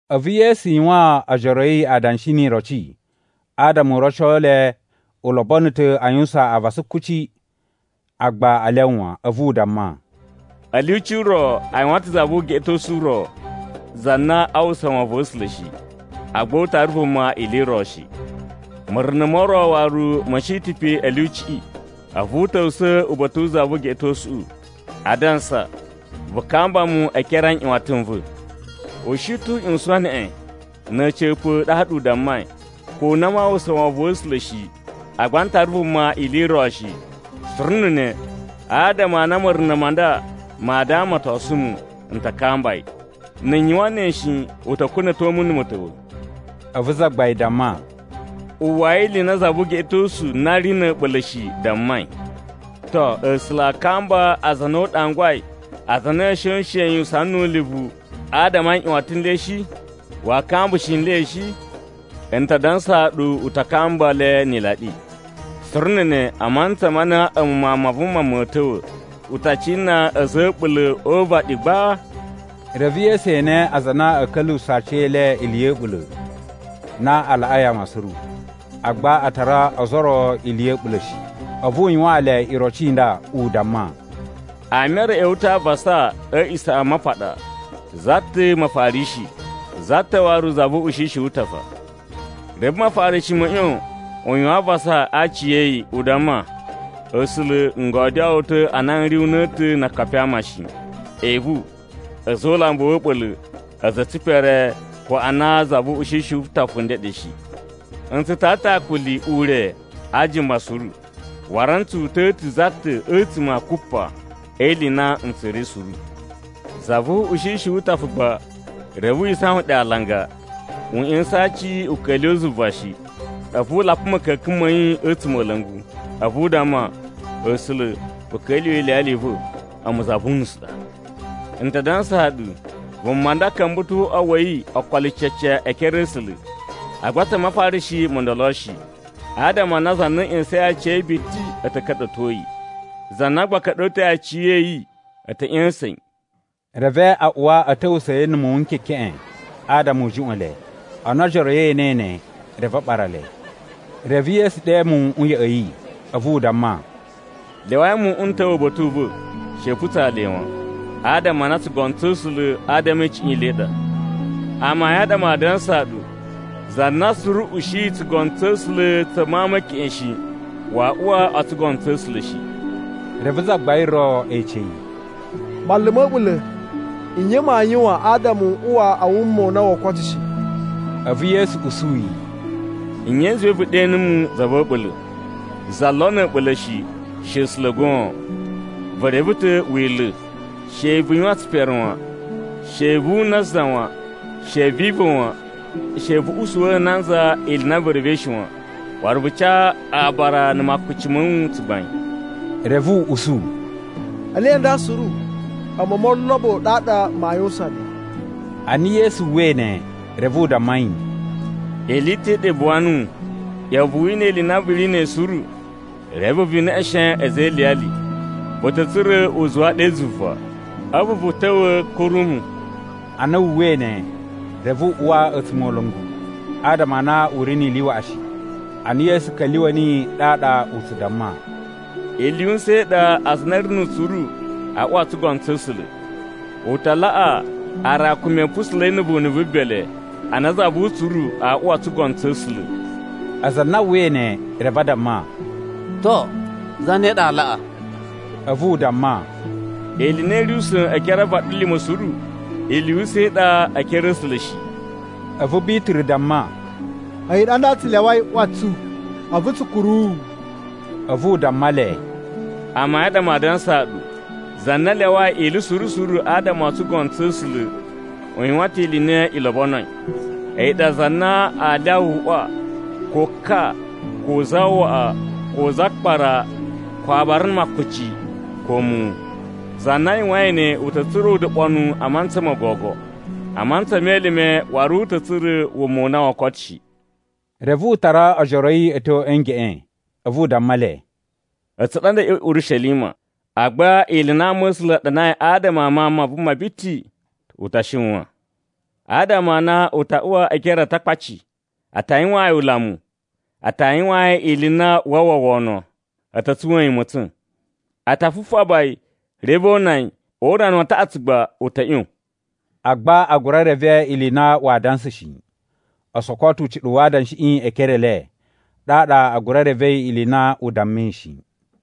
A̱vu Yesu yuwaan ojoro a̱ yi adanshi ni iroci adama u roco le u lobono ta̱ a yuwusan avasa kuci, agba a lyawa wan. A̱vu u damma, “A̱ lyuci ro a yuwan ta̱ za vu ugeꞌetosu ro, za na aa uwwusa wovon wa̱ A̱sula̱ shi, agba u tara vuma ili i ro shi. Ma̱runa̱ mo ro waru ma̱ shi ta̱ pe a̱ lyuciꞌi, a̱vu u ta̱wusa̱ uba̱ta̱ wu za vu ugeꞌetosuꞌu, adansa, ‘Vu kamba mu e ekere a nꞌyuwatan n va̱.’ “U shi ta̱ u ꞌyuwusan neꞌen. Na̱ a̱ca̱pa̱, ɗaɗa u dammai, ‘Ko ana maa uwwusa wovon wa̱ A̱sula̱ shi, agba n tara vuma ili i ro shi, suru na̱ ne, adama a na ma̱runa̱ ma nda maa damatosun mu, n ta kamba yi. Na̱ n yuwan ne shi, u ta̱ kuna̱to mu na̱ ma̱ta̱wa̱!’” A̱vu Zagbain damma, “Uwwai ili i na za vu ugeꞌetosu na ri na̱ a̱ɓula̱ shi dammai. To, A̱sula̱ aa kamba aza a na u ɗangwai, aza a na a̱a̱ shoshen yi usana nu ulivu, adama a nꞌyuwatan n le shi? Waa kambushi nle shi? N ta dansaa ɗu u ta kamba le ni ilaɗi. Suru na̱ ne, a mantsa ma na a̱mu Mawun ma Vuma ma̱a̱ ta̱wa̱, u ta cina a̱za̱ a̱ a̱ɓula̱ o uvaɗi gba?” Reve Yesu ene aza a na a̱a̱ ka̱lyuwusa̱ aciyele ili ya̱ a̱ɓula̱, na a laꞌai ama suru, agba a tara ozo o ro ili ya̱ a̱ɓula̱ shi. A̱vu u yuwaan le iroci i nda, u damma, “Ama e re a̱ ꞌya̱wa̱ ta̱ avasa a̱ A̱a̱ꞌisamapaɗa: za ta̱ Mafarishi, za ta̱ waru za vu ushishi wu utafa. Reve Mafarishi ma̱ ꞌyon u yuwan avasa a aciya̱yi, u damma, ‘A̱sula̱, n godyoo wu ta̱ a na n ri una̱ta̱ na akapi a ama shi, evu, a̱za̱ o ulambu wa̱ a̱ɓula̱, a̱za̱ a̱ tsipere ko ana za vu ushishi wu utafa u ndeɗe shi. N tsu tara ta̱ akuli ure a ajuma suru. Waru n tsu uta̱ ta̱ za ta̱ a̱tsuma̱ a kupa e ili i na n tsura̱i suru.’ “Za vu ushishi wu utafa gba reve wi isawan ɗe alanga. U ꞌya̱sa̱n aaci u ka̱lyuwa̱ zuva shi. A̱vu u lapa ma̱ka̱ka̱n ma̱ yi a̱ a̱tsumola̱ngu, a̱vu u damma, ‘A̱sula̱ vu ka̱lyuwa̱ iliyali i va̱, a̱mu za vu unusu ɗa!’ “N ta dansaa ɗu, vuma nda ka̱mba̱ ta̱ o uꞌwa wa̱ yi ookolo cece e ekere a̱ A̱sula̱, agba tsa Mafarishi mo ndolo shi. Adama a na za na ꞌya̱sa̱in aciya̱yi biti a̱ ta̱ ka̱ɗa̱to yi, za na gba ka̱ɗa̱toi aciya̱yi, a̱ ta̱ ꞌya̱sa̱n yi.” Reve a uwa a̱ ta̱wusa̱a̱ yi na̱ muwun n kekeꞌen, adama u juꞌwa̱n le. Ana ojoro a̱ yi e enei ne, reve a ɓara le. Reve Yesu ɗe muwuꞌun ya̱ꞌa̱ yi, a̱vu u damma, “Lyawai muwuꞌun a̱ ta̱wa̱ uba̱ta̱ u va̱, she i putsa le wan. Adama a na tsugono tsa̱ A̱sula̱, adama e icuꞌun i le i ɗa. Amayun a ɗa maa dansaa ɗu, za na suru ushiyi tsugono tsa̱ A̱sula̱ tsa mawun me keꞌen shi, waa uwa o tsugono tsa̱ A̱sula̱ shi.” Reve zagbain ro ece yi, “Manlu ma̱ a̱ɓula̱, nye maa yuwan adama n uwa a wuma u na woo koto shi?” A̱vu Yesu usu yi, “Nye i zuwai vu ɗe numu, za va̱ a̱ɓula̱? Za lo na̱ a̱ɓula̱ shi, she A̱sula̱ goon. Vu reve ta̱ Wila̱: ‘She vu yuwan tsipere wan. She vu una za wan. She vi iva̱ wan. She vu usuwa̱ nanza ili i na vu revei shi wan. Waru vu ca abara na̱ makuci ma̱ wu tsugbain.’” Reve u usu, “Ele nda suru, a̱mu o molobo ɗaɗa maa yuwusan le.” Ana Yesu uwwai ne, reve u damma yi, “Ili i ta̱ i ɗa i buwa nuwu. ꞌYa̱wa̱ vu wina ili i na vu ri na̱ a̱yi suru, reve vu neꞌeshen a̱za̱ e iliyali. Vu ta̱ tsura̱ uzuwa ɗe zuva. A̱vu vu ta̱wa̱ kuru mu.” Ana wu uwwai ne, reve u uwa a̱tsumola̱ngu, adama a na u ri ni ili waꞌashi. Ana Yesu ka̱lyuwa̱ niyi, ɗaɗa u tsu damma, “Ili yu usa̱n i ɗa aza a na a̱ ri nu utsuru a uwa o tsugono tsa̱ A̱sula̱. U ta laꞌa aarakumi a̱ pusula̱i na̱ vunu vu bele, ana za vu utsuru aa uwa o tsugono tsa̱ A̱sula̱.” Aza a na a uwwai ne, reve a damma, “To, zane ɗa aa laꞌa?” A̱vu u damma, “Ili i na i ri usa̱n e ekere a vaɗilima̱ suru, ili yu usa̱n i ɗa e ekere a̱ A̱sula̱ shi.” A̱vu Bituru damma, “A̱yi ɗa nda tsu lyawai ꞌwa tsu, a̱vu tsu kuru wu.” A̱vu u damma le, “Amayun a ɗa maa dansaa ɗu, za na lyawai ili suru suru adama o tsugono tsa̱ A̱sula̱, u yuwan ta̱ ili i na i lobonoi. A̱yi ɗa za na aa lyawa uꞌwa, ko ka, ko zawaꞌa, ko zakpara, ko abara na̱ makuci, ko muwun. Za na yuwain ne, u ta̱ tsura̱ udoɓonuwu a mantsa mo gogo. A mantsa me elime, waru u ta̱ tsura̱ wuma u na woo koto shi.” Reve u tara ojoro a̱ yi a̱ tyo a̱ ngeꞌen, a̱vu u damma le, “A̱tsu ɗa nda a̱ ꞌya̱wa̱ Urishelima, agba ili i na ama̱sula̱ a ɗanai adama a Mawun ma Vuma biti, u ta shiwan. Adama a na u ta uwa e ekere a Atakpaci, a ta yuwaan yi ulamu. A ta yuwaan yi ili i na waa uwwa wono. A̱ ta̱ tsuwa̱a̱n yi ma̱tsa̱n. A ta fufaba yi, reve o una yi. O urana wa taꞌatsu gba u ta̱ ꞌyon.” Agba a gura reve ili i na waa dansa shi. O soko ta̱ ucuɗuwu wa adanshiꞌi e ekere e le, ɗaɗa a gura revei ili i na u dammai shi.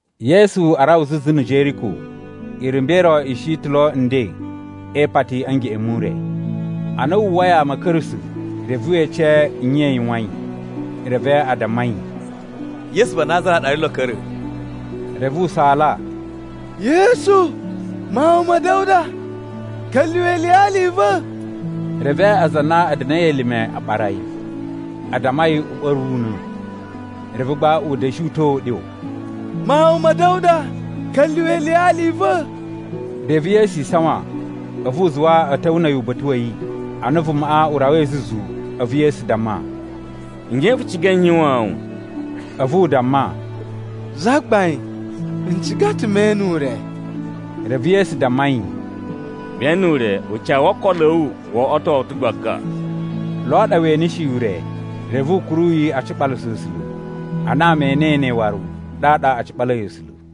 Yesu arawa zuzu na̱ Jeriko, irumba̱ i ro i shi ta̱ lo nden e ipati a̱ ngeꞌen mu ure. Ana wu uwwai ama a̱ ka̱ra̱sa̱, reve we ece nye i yuwain. Reve a damma yi, “Yesu va Nazara ɗa ri lo a̱ ka̱ra̱.” Reve u saala, “Yesu, Mawun ma̱ Da̱wuda, ka̱lyuwa̱ iliyali i va̱!” Reve aza a na a̱ da̱na̱i elime a ɓara yi, a damma yi u ɓa̱ru una̱. Reve gba u da̱shi uta̱a̱ uɗyo, “Mawun ma̱ Da̱wuda, ka̱lyuwa̱ iliyali i va̱!” Reve Yesu isawan, a̱vu u zuwa a̱ ta̱wa̱ na̱ a̱yi uba̱ta̱ wa̱ yi. Ana vumaꞌa u rawai zuzu, a̱vu Yesu damma, “Nye vu ciga n yuwaan wu?” A̱vu u damma, “Zagbain, n ciga ta̱ me ene ure.” Reve Yesu damma yi, “Ve ene ure. Ucawu wo okolo a̱ wu wo oꞌwoto wu ta̱ gbaga.” Lo ɗa we eneshi ure, reve u kuru yi a ciɓalasa A̱sula̱. Ana ama e enei ne waru, ɗaɗa a ciɓalai A̱sula̱.